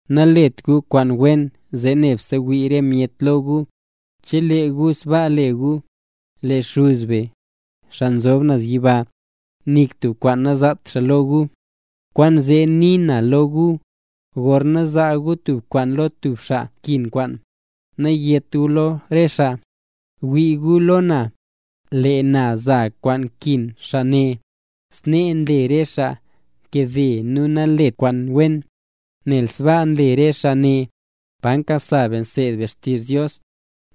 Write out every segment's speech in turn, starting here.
’Nalet gu kwaan wen zee nebse wii re myet lo gu; chelee gu sbaa le gu, lee Xuz be, xaa nzob naz yiba, nik tub kwaan nazaat xaa lo gu. ’Kwaanzee nii na lo gu, gorna zaa gu tub kwaan lo tub xaa nkin kwaan, nayét gu lo rese xaa: “Wii gu lo na, lee na zaa kwaan kin xaa ne”, snee nle re xaa nkade nu nanlet kwaan wen. Nel sbaa nle re xaa ne, pa nkasa be nseed be xtizh Dios,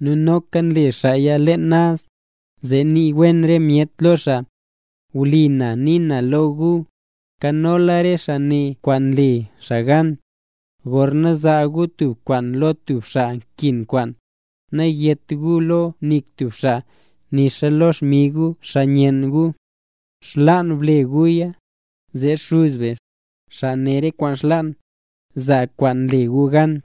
nu noka nle xaaya leen naz, zee nii wen re myet lo xaa. Wlipa na nii na lo gu, nkanola re xaa ne kwaan le xaa gan. Gorna zaa gu tub kwaan lo tub xaa nkin kwaan, nayét guya lo nik tub xaa, nixa lo xmig gu xaa nyenn gu. Xlaan ble guya, zee Xuz be, xaa ne re kwaan xlaan, zaa kwaan le gu gan.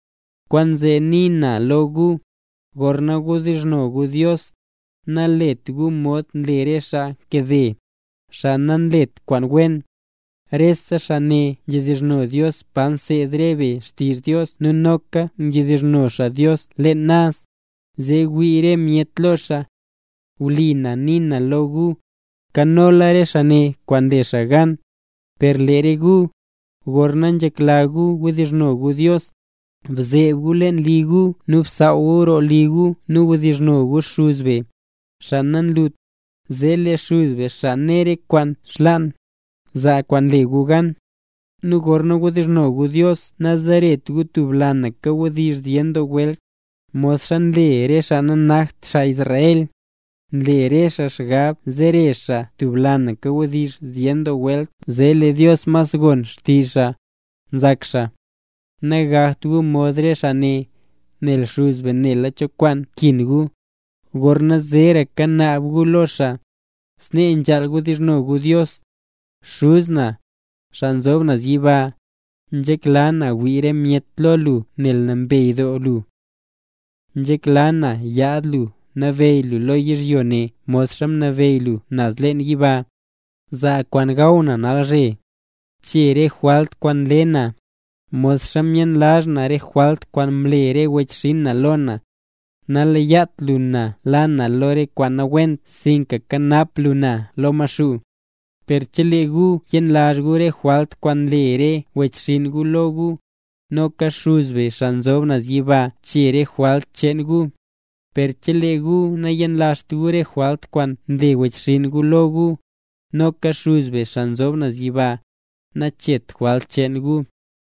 ’Kwaanzee nii na lo gu, gorna wdizhno gu Dios, nalet gu mod nle re xaa nkade, xaa nanlet kwaan wen. Re xaa ne nzhedizhno Dios pa nseed re be xtizh Dios nu noka nzhedizhno xaa Dios leen naz, zee wii re myet lo xaa. Wlipa na nii na lo gu, nkanola re xaa ne kwaan le xaa gan. Per lee re gu, gorna nzhekla gu wdizhno gu Dios, bzeeb gu leen li gu nu bsaaw roo li gu nu wdizhno gu Xuz be, xaa nanlut, zee lee Xuz be xaa ne re kwaan xlaan, zaa kwaan le gu gan. ’Nu gorna wdizhno gu Dios nazeret gu tub lanaka wdizh zyen doo welt, modxa nle re xaa nanakt xaa Israel. Nle xaa xgab zere xaa tub lanaka wdizh zyen doo welt zee lee Dios mas gon xtizh xaa, nzak xaa. Nagakt gu mod re xaa ne; nel Xuz be nela cho kwaan nkin gu, gorna zeeraka naab guya lo xaa. Snee nzhaal wdizhno gu Dios: Xuz na, xaa nzob naz yiba, nzhekla na wii re myet lo lu nel nambey doo lu. Nzhekla na yaad lu nabeyy lu lo yizhyo ne modxa nabeyy lu naz leen yiba. Zaa kwaan gaw na nalzhe. Bchee rese jwalt kwaan mle na, modxa myenlazh na re jwalt kwaan mle re wechxinn na lo na. Naleyat lu na la na lo re kwaan nawent sinka bkanap na lo Maxuu. ’Per chelee gu yenlazh gu re jwalt kwaan mle re wechxinn gu lo gu, noka Xuz be xaa nzob naz yiba chee re jwalt cheen gu. Per chelee gu nayenlazht gu re jwalt kwaan mle wechxinn gu lo gu, noka Xuz be xaa nzob naz yiba, nacheet jwalt cheen gu.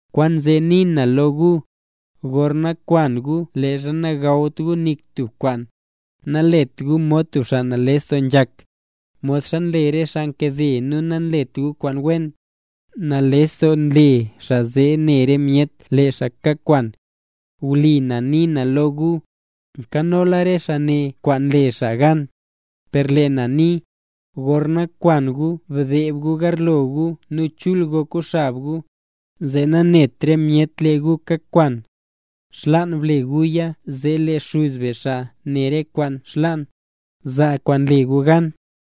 ’Kwaanzee nii na lo gu, gorna kwan gu leezha nagawt gu nik tub kwaan, nalet gu mod tub xaa nales doo nzhak, modxa nle re xaa nkade nu nanlet kwaan wen. Nales doo nle xaa zee ne re myet lee xaa kakwan. Wlipa na nii na lo gu, nkanola re xaa ne kwaan le xaa gan. Per lee na nii, gorna kwan gu bdeeb gu garlo gu nu chul gok gu xab gu, zee nanet re myet lee gu kakwan. Xlaan ble guya zee lee Xuz be xaa ne re kwaan xlaan, zaa kwaan le gu gan.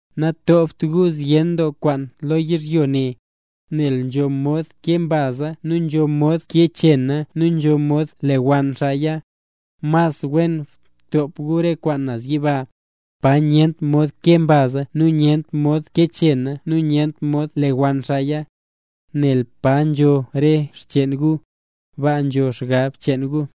’Natopt gu zyen doo kwaan lo yizhyo ne, nel nzho mod kee mbaza nu nzho mod kee chena nu nzho mod lewann xaaya. Mas wen btop gu re kwaan naz yiba, pa nyent mod kee mbaza nu pa nyent mod kee chena nu pa nyent mod lewann xaaya. Nel pa nzho re xcheen gu, baa nzo xgab cheen gu.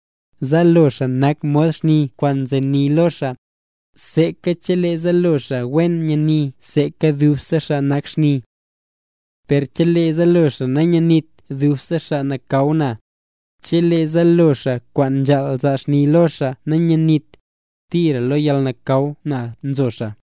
’Zaalo xaa nak mod xni kwaan nzeni lo xaa. Seeka chelee zaalo xaa wen nyani zee dubse xaa nak xni. Per chelee zaalo xaa nanyenit zee dubse xaa nakaw na. Chelee zaalo xaa kwaan nzhaal zaa xni lo xaa nanyenit, tira lo yalnakaw na nzo xaa.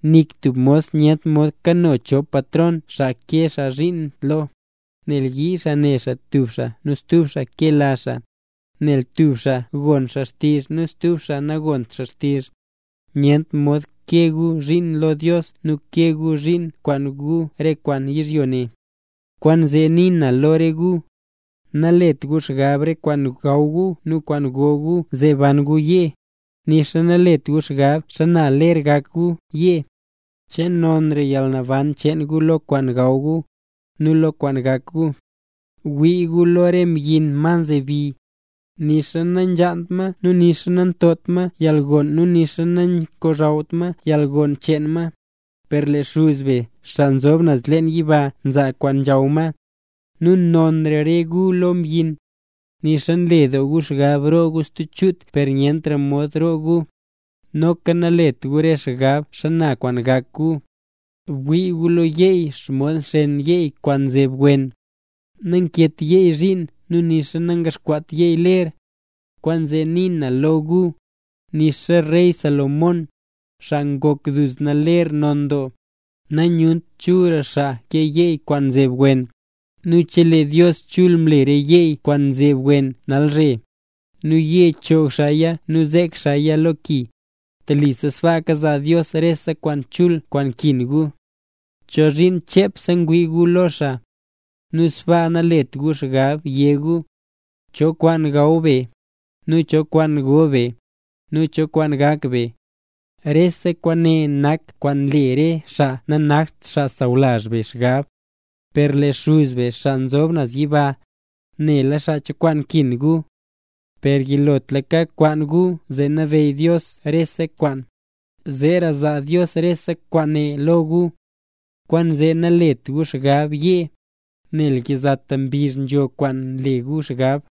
’Nik tub mos nyent mod kano chop patron xaa kee xaa zhiin lo, nel yii xaa ne xaa tub xaa nu stub xaa kela xaa, nel tub xaa gon xaa xtizh nu stub xaa nagont xaa xtizh. Nyent mod kee gu zhiin lo Dios nu kee gu zhiin kwaan gu re kwaan yizhyo ne. ’Kwaanzee nii na lo re gu: Nalet gu xgab re kwaan gaw gu nu kwaan go gu zee ban gu yee, nixa nalet gu xgab xana ler gak gu yee. ¿Che nonra yalnaban cheen gu lo kwaan gaw gu, nu lo kwaan gak gu? Bwii gu lo re mbyin ma nzebi. Nixa nanzhaant ma nu nixa nantopt ma yalgon nu nixa nangochawt ma yalgon cheen ma, per lee Xuz be xaa nzob naz leen yiba nzaa kwaan nzhaw ma. Nu nonra re gu lo re mbyin. Nixa nle doo gu xgab roo gu stub chut per nyentra mod roo gu. ’Noka nalet re gu xgab xana gak gu. Bwii gu lo re yeey, xomod nxeen yeey kwaan nzeb wen. Nankeet yeey zhiin nu nixa nangaxkwaat yeey ler. Kwaanzee nii na lo gu, nixa rey Salomón, xaa ngok duzna ler non doo, namyunt chulra xaa ke re yeey kwaan nzeb wen. Nu chelee Dios chul mle re yeey kwaan nzeb wen nalzhe, nu yee choog xaaya nu zek xaaya lo ki, telisa sbaaka zaa Dios rese kwaan chul kwaan nkin gu. ¿Chozhiin chepse ngwii gu lo xaa? Nu sbaa nalet gu xgab yé gu: “¿Cho kwaan gaw be, nu cho kwaan go be, nu cho kwaan gak be?” Rese kwaane nak kwaan nle re xaa nanakt xaa sawlazh be xgab. Per lee Xuz be, xaa nzob naz yiba, nela xaa cho kwaan nkin gu. Per yilotlaka kwaan gu zee nabeyy Dios rese kwaan, zeera zaa Dios rese kwaane lo gu. Kwaanzee nalet gu xgab yee, nel yizata mbizh nzho kwaan le gu xgab.